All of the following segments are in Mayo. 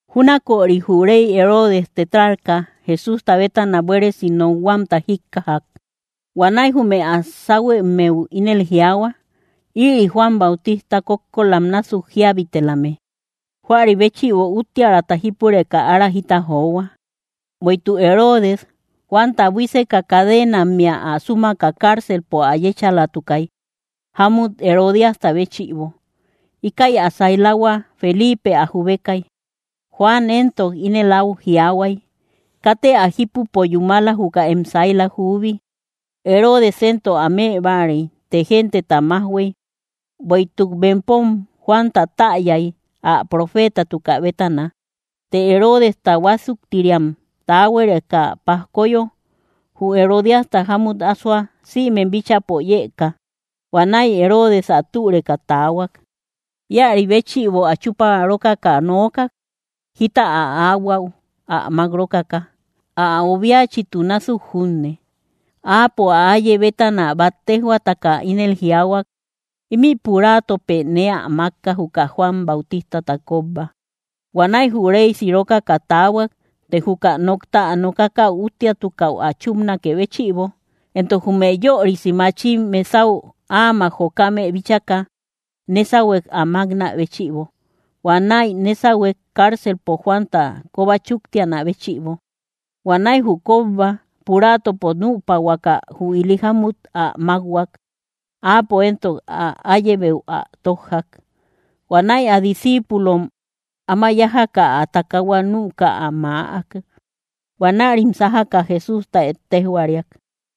Júnaköri jü rey Heroodes tetrarca, Jesústa bétana buéresi nokhuamta jíkkajak. Huanäi jume ä sáhuemmeu ínel jiaahua: —Ïri Juan Bautista kókkolam násuk jíabitelame; huäri béchïbo úttiäraata jípureka ára jita johua. Bueïtuk Heroodes, Juanta buíseka cadenammea ä súmaka carcelpo ä yéchalatukay, jámut Herodíasta béchïbo. Íkäi ä sailahua Felipe ä jubekay. Juan éntok ínel áu jiaahuay: —Katë ä jípupo yúmala, juka em saila juubi. Heroodes éntok ä mëbáarey, të genteta májhuey; bueïtuk bempom Juanta täyay, ä profeetatukä bétana. Të Heroodesta huásuktiriam taahuareka pajkoyo, jü Herodíasta jámut asoa, sïmem bíchäpo yëka. Huanäi Heroodes ä türeka taahuak. Íäri béchïbo, ä chúpa rókaka nookak, jita ä ahuaü ä mák rókaka, ä obiachitu násuk junne. Áapo ä áye bétana bát téjhuaataka ínel jiaahuak: —Ímï puraatopë nee ä mákka, juka Juan Bautistata kóbba. Huanäi jü réy sirokaka taahuak; të juka nokta ä nokakäu úttiatukäu ä chúpnakë béchïbo, entok jume yörisi machim mesau áamak jokame bíchaka, nésahuek ä máknä béchïbo. Huanäi nésahuek, carcelpo Juanta kóba chúktianä béchïbo. Huanäi jü kóbba, puraatopo nüpahuakä, jü ili jámut ä mákhuak; áapo éntok ä áyebeu ä tójjak. Huanäi ä discíipulom áma yájaka, ä takaahua nüka ä maäk. Huanärim sájaka Jesústa ettejhuariak.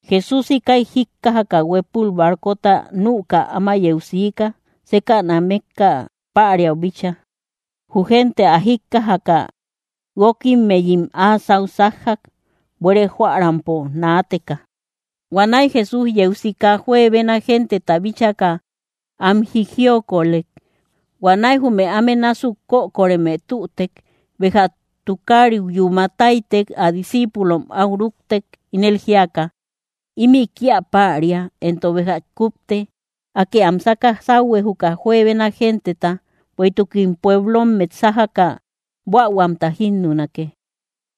Jesús íkäi jíkkajaka, huépul barcota nüka áma yeu siika, sékäna mékka päriau bíchaa. Jü gente ä jíkkajaka guókimmeyim áa sáu sájjak, buére jóärampo naateka. Huanäi Jesús yeu sika, juebena genteta bíchaka, am jijiokolek. Huanäi jume áme násuk kökoreme tütek. Béja tukariu yúma táytey, ä discíipulom áu rúktek, ínel jíaka: —Ímï kía päria, entok béja kúpte; Akë am sáka sáuhue, juka juebena genteta, bueïtukim pueblommet sájaka buähuamta jínnunake.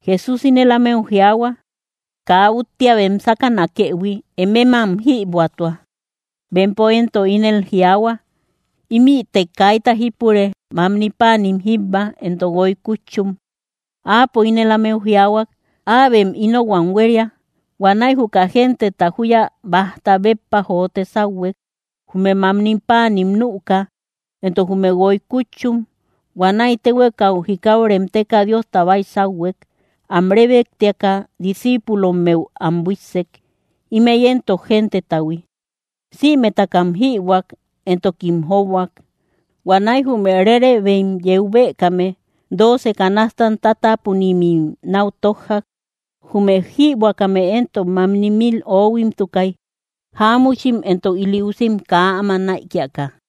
Jesús ínel ámeu jiaahua: —Kaa úttia bem sákanakëhui; emem am jïbuätua. Bempo éntok ínel jiaahua: —Ímïte kaita jípure, mamni páanin jíbba entok guoy kútchum. Áapo ínel ámeu jiaahuak: —Äbem ínohuam huéria. Huanäi juka genteta júya bájta béppa jote sáuhuek. Jume mamni páanim nüka, entok jume guoy kútchum. Huanäi téhuekau jikau remteka, Diosta baysauhuek. Am rébektiaka discíipulommeu am buíssek; ímëi éntok gentetahui. Sïmetakam jïbuäk, entokim jóbuak. Huanäi jume rerebem yeu bëkame, dooce canastam tátapunimim náu tójjak. Jume jïbuäkame éntok mamni mil ohuimtukay, jáamuchim entok ili usim kaa áma näikiaka.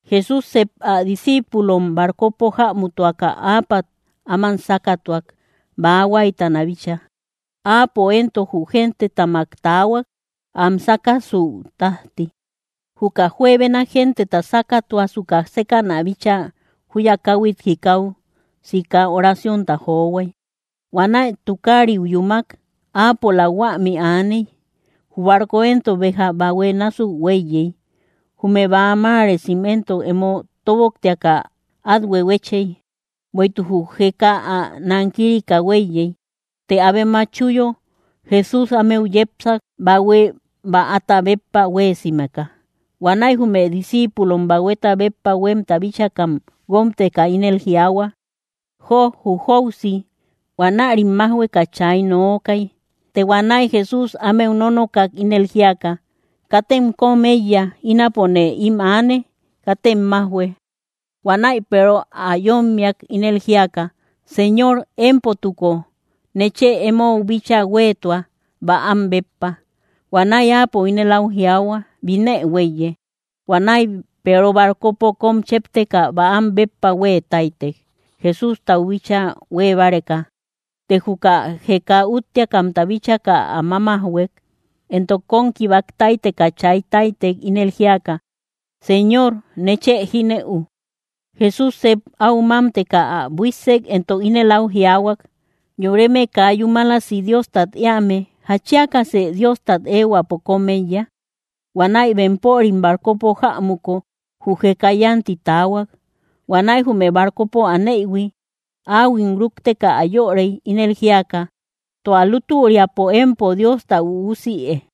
Jesús sep ä discíipulom barcopo jämutuaka áapat am sákatuak, bäa huáytana bíchaa. Áapo éntok jü gentetamak taahuak, am sákasuü tájti. Juka juebena genteta sákatuasuka, sékäna bíchaa júya káhuit jikau sika oraciónta johuay. Huanäi tukariu yúmak, áapola huämi aaney. Jü barco éntok béja bahue násuk huéiyey, jume bäa maaresim éntok emo tóboktiaka át huehuechey. Bueïtuk jü jeka ä nankirika huéiyey. Të abe matchuyo, Jesús ámeu yepsak, bahue bäata béppa huéesimeka. Huanäi jume discíipulom, bahueta béppa huémta bíchakam guómteka, ínel jiaahua: —¡Jo jü jóusi! Huanärim májhueka chay nookay. Të huanäi Jesús ámeu nónokak, ínel jíaka: —¡Katem kom éiya! Ínapone ím aane. ¡Katem majhuë! Huanäi Peero ä yómmiak, ínel jíaka: —Señor, émpotuko, nechë emou bíchaa huéetua, bäam béppa. Huanäi Áapo ínel áu jiaahuak: —Binë huéiye. Huanäi Peero barcopo kom chépteka, bäam béppa huée táytek, Jesústau bíchaa huée báreka. Të juka jeka úttiakamta bíchaka ä mámajhuek, entok kom kikkibak táyteka, chay táytek, ínel jíaka: —¡Señor, nechë jínëu! Jesús sep áu mámteka, ä buíssek, entok ínel áu jiaahuak: —¡Yoreme kaa yúmalasi Diostat éame! ¿Jatchiakasë Diostat éehuäpo kom éiya? Huanäi bempörim barcopo jämuko, jü jeka yánti taahuak. Huanäi jume barcopo aneïhui áhuim rúkteka ä yörey, ínel jíaka: —¡Tua lútüriapo empo Diosta üusïe!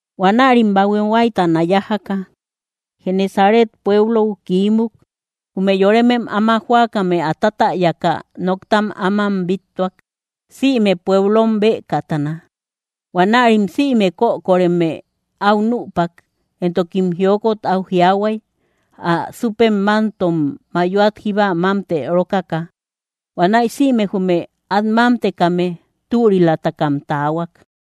Huanärim bahue huáytana yájaka, Genesaret pueblou kiímuk. Jume yoremem áma jóakame ä tátäyaka, noktam áman bíttuak, sïme pueblom beekatana. Huanärim sïme kökoreme áu nüpak, entokim jiokot áu jiaahuay, ä súpem mantom mayoat jíba mámte rókaka. Huanäi sïme jume át mámtekame, türilatakam taahuak.